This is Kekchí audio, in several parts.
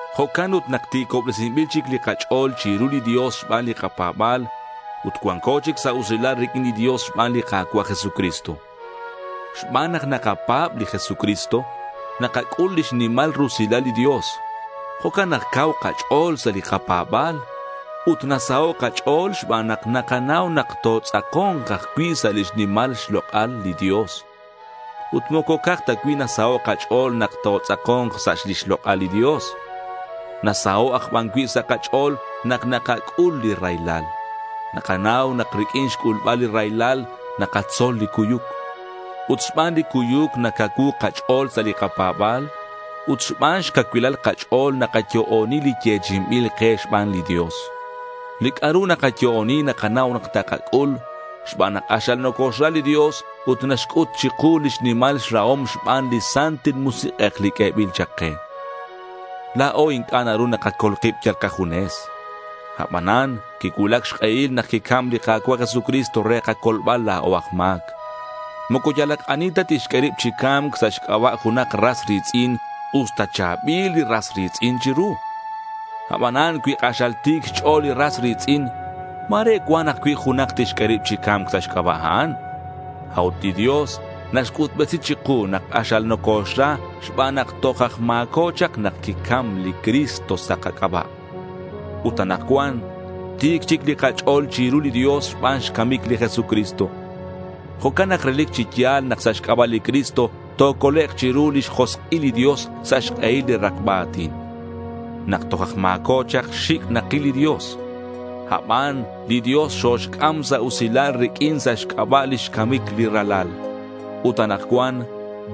Jo'can ut nak ti̱cobresinbil chic li kach'o̱l chiru li Dios xban li kapa̱ba̱l, ut cuanco chic sa' usilal riq'uin li Dios xban li Ka̱cua' Jesucristo. Xban nak nakapa̱b li Jesucristo nakac'ul lix nimal rusilal li Dios. Jo'can nak cau kach'o̱l sa' li kapa̱ba̱l. Ut nasaho' kach'o̱l xban nak nakanau nak totz'ako̱nk ajcui' sa' lix nimal xlok'al li Dios. Ut moco ca'aj cui' ta nasaho' kach'o̱l nak totz'ako̱nk sa' lix lok'al li Dios. Nasaho' aj ban cui' sa' kach'o̱l nak nakac'ul li raylal. Nakanau nak riq'uin xc'ulbal li raylal nakatzol li cuyuc. Ut xban li cuyuc nacacuu kach'o̱l sa' li kapa̱ba̱l, ut xban xcacuilal kach'o̱l nakayo'oni li yechi'inbil ke xban li Dios. Li c'a'ru nakayo'oni nakanau nak takac'ul, xban nak k'axal nocoxra li Dios ut naxc'ut chiku lix nimal xrahom xban li Santil Musik'ej li q'uebil chak ke. La̱o inc'a' naru nakacol kib yal kajunes. Abanan quicuulac xk'ehil nak quicam li Ka̱cua' Jesucristo re kacolbal la̱o aj ma̱c. Moco yalak ani ta tixq'ue rib chi ca̱mc sa' xc'aba' junak ras ri̱tz'in usta cha̱bil li ras ri̱tz'in chiru. Abanan cui k'axal ti̱c xch'o̱l li ras ri̱tz'in, ma̱re cuan ajcui' junak tixq'ue rib chi ca̱mc sa' xc'aba' a'an. A'ut li Dios naxc'utbesi chiku nak k'axal nocoxra xban nak toj aj ma̱co chak nak quicam li Cristo sa' kac'aba'. Ut anakcuan ti̱c chic li kach'o̱l chiru li Dios xban xcamic li Jesucristo. Jo'can nak relic chi ya̱l nak sa' xc'aba' li Cristo tocolek' chiru lix josk'il li Dios sa' xk'ehil li rakba a̱tin. Nak toj aj ma̱co chak xic' nakil li Dios. Aban li Dios xoxc'am sa' usilal riq'uin sa' xc'aba' lix camic li Ralal. Ut anakcuan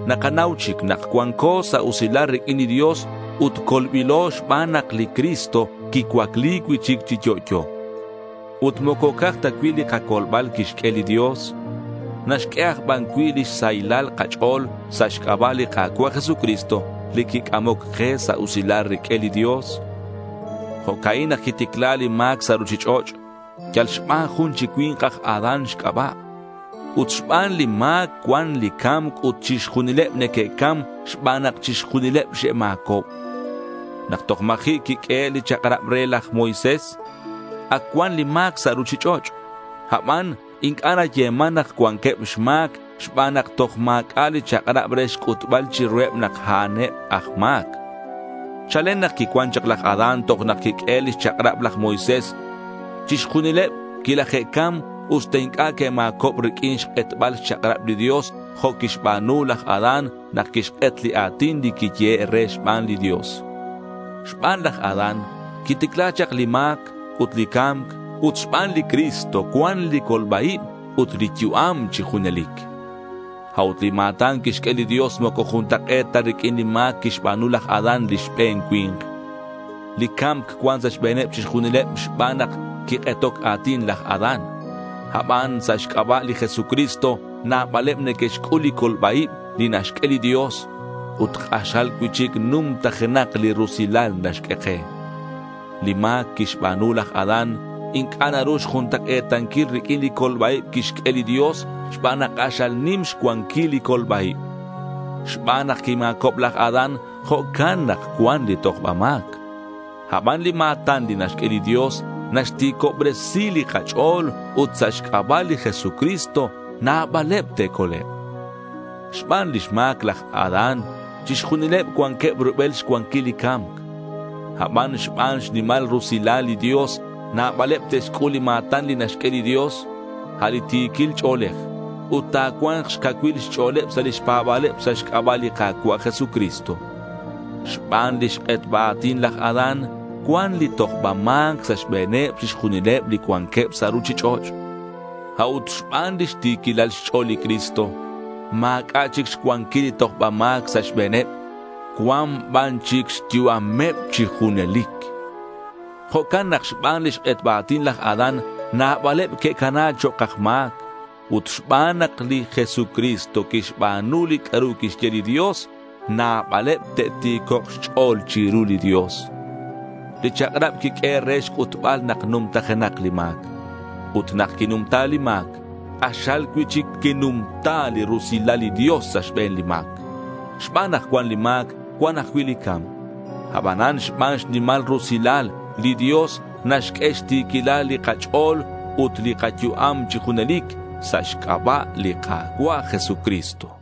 nakanau chic nak cuanco sa' usilal riq'uin li Dios ut colbilo xban nak li Cristo quicuacli cui'chic chi yo'yo. Ut moco ca'aj cui' ta li kacolbal quixq'ue li Dios. Naxq'ue aj ban cui' lix sahilal kach'o̱l sa' xc'aba' li Ka̱cua' Jesucristo li quic'amoc ke sa' usilal riq'uin li Dios. Jo'ca'in nak quiticla li ma̱c sa' ruchich'och', yal xban jun chi cui̱nk aj Adán xc'aba'. Ut xban li ma̱c cuan li ca̱mc ut chixjunileb neque'cam xban nak chixjunileb xe'ma̱cob. Nak toj ma̱ji' quiq'uehe' li chak'rab re laj Moisés, ac cuan li ma̱c sa' ruchich'och'. Aban inc'a' nayeman nak cuanqueb xma̱c xban nak toj ma̱c'a' li chak'rab re xc'utbal chiruheb nak a'an eb aj ma̱c. Chalen nak quicuan chak laj Adán toj nak quiq'uehe' lix chak'rab laj Moisés, chixjunileb quilaje'cam usta inc'a' que'ma̱cob riq'uin xk'etbal xchak'rab li Dios jo' quixba̱nu laj Adán nak quixk'et li a̱tin li quiyehe' re xban li Dios. Xban laj Adán quiticla chak li ma̱c ut li ca̱mc, ut xban li Cristo cuan li colba-ib ut li yu'am chi junelic. A'ut li ma̱tan naxq'ue li Dios moco juntak'e̱t ta riq'uin li ma̱c quixba̱nu laj Adán li xbe̱n cui̱nk. Li ca̱mc cuan sa' xbe̱neb chixjunileb xban nak quik'etoc a̱tin laj Adán. Aban sa' xc'aba' li Jesucristo nabaleb neque'xc'ul li colba-ib li naxq'ue li Dios. Ut k'axal cui'chic numtajenak li rusilal naxq'ue ke. Li ma̱c quixba̱nu laj Adán inc'a' naru xjuntak'e̱tanquil riq'uin li colba-ib quixq'ue li Dios xban nak k'axal nim xcuanquil li colba-ib. Xban nak quima̱cob laj Adán, jo'can nak cuan li tojba ma̱c. Aban li ma̱tan li naxq'ue li Dios naxti̱cobresi li kach'o̱l ut sa' xc'aba' li Jesucristo nabaleb te'colek'. Xban lix ma̱c laj Adán, chixjunileb cuanqueb rubel xcuanquil li ca̱mc. Aban xban xnimal rusilal li Dios, nabaleb te'xc'ul li ma̱tan li naxq'ue li Dios, a' li ti̱quil ch'o̱lej, ut ta̱cua̱nk xcacuil xch'o̱leb sa' lix pa̱ba̱leb sa' xc'aba' li Ka̱cua' Jesucristo. Xban lix k'etba a̱tin laj Adán cuan li tojba ma̱c sa' xbe̱neb chixjunileb li cuanqueb sa' ruchich'och'. A'ut xban lix ti̱quilal xch'o̱l li Cristo, ma̱c'a' chic xcuanquil li tojba ma̱c sa' xbe̱neb. Cua̱nk ban chic xyu'ameb chi junelic. Jo'can nak xban lix k'etba a̱tin laj Adán, nabaleb que'cana chok' aj ma̱c. Ut xban nak li Jesucristo quixba̱nu li c'a'ru quixye li Dios, nabaleb te'ti̱cok' xch'o̱l chiru li Dios. Li chak'rab quiq'uehe' re xc'utbal nak numtajenak li ma̱c. Ut nak quinumta li ma̱c, k'axal cui'chic quinumta li rusilal li Dios sa' xbe̱n li ma̱c. Xban nak cuan li ma̱c, cuan ajcui' li ca̱mc. Abanan xban xnimal rusilal, li Dios naxq'ue xti̱quilal li kach'o̱l ut li kayu'am chi junelic sa' xc'aba' li Ka̱cua' Jesucristo.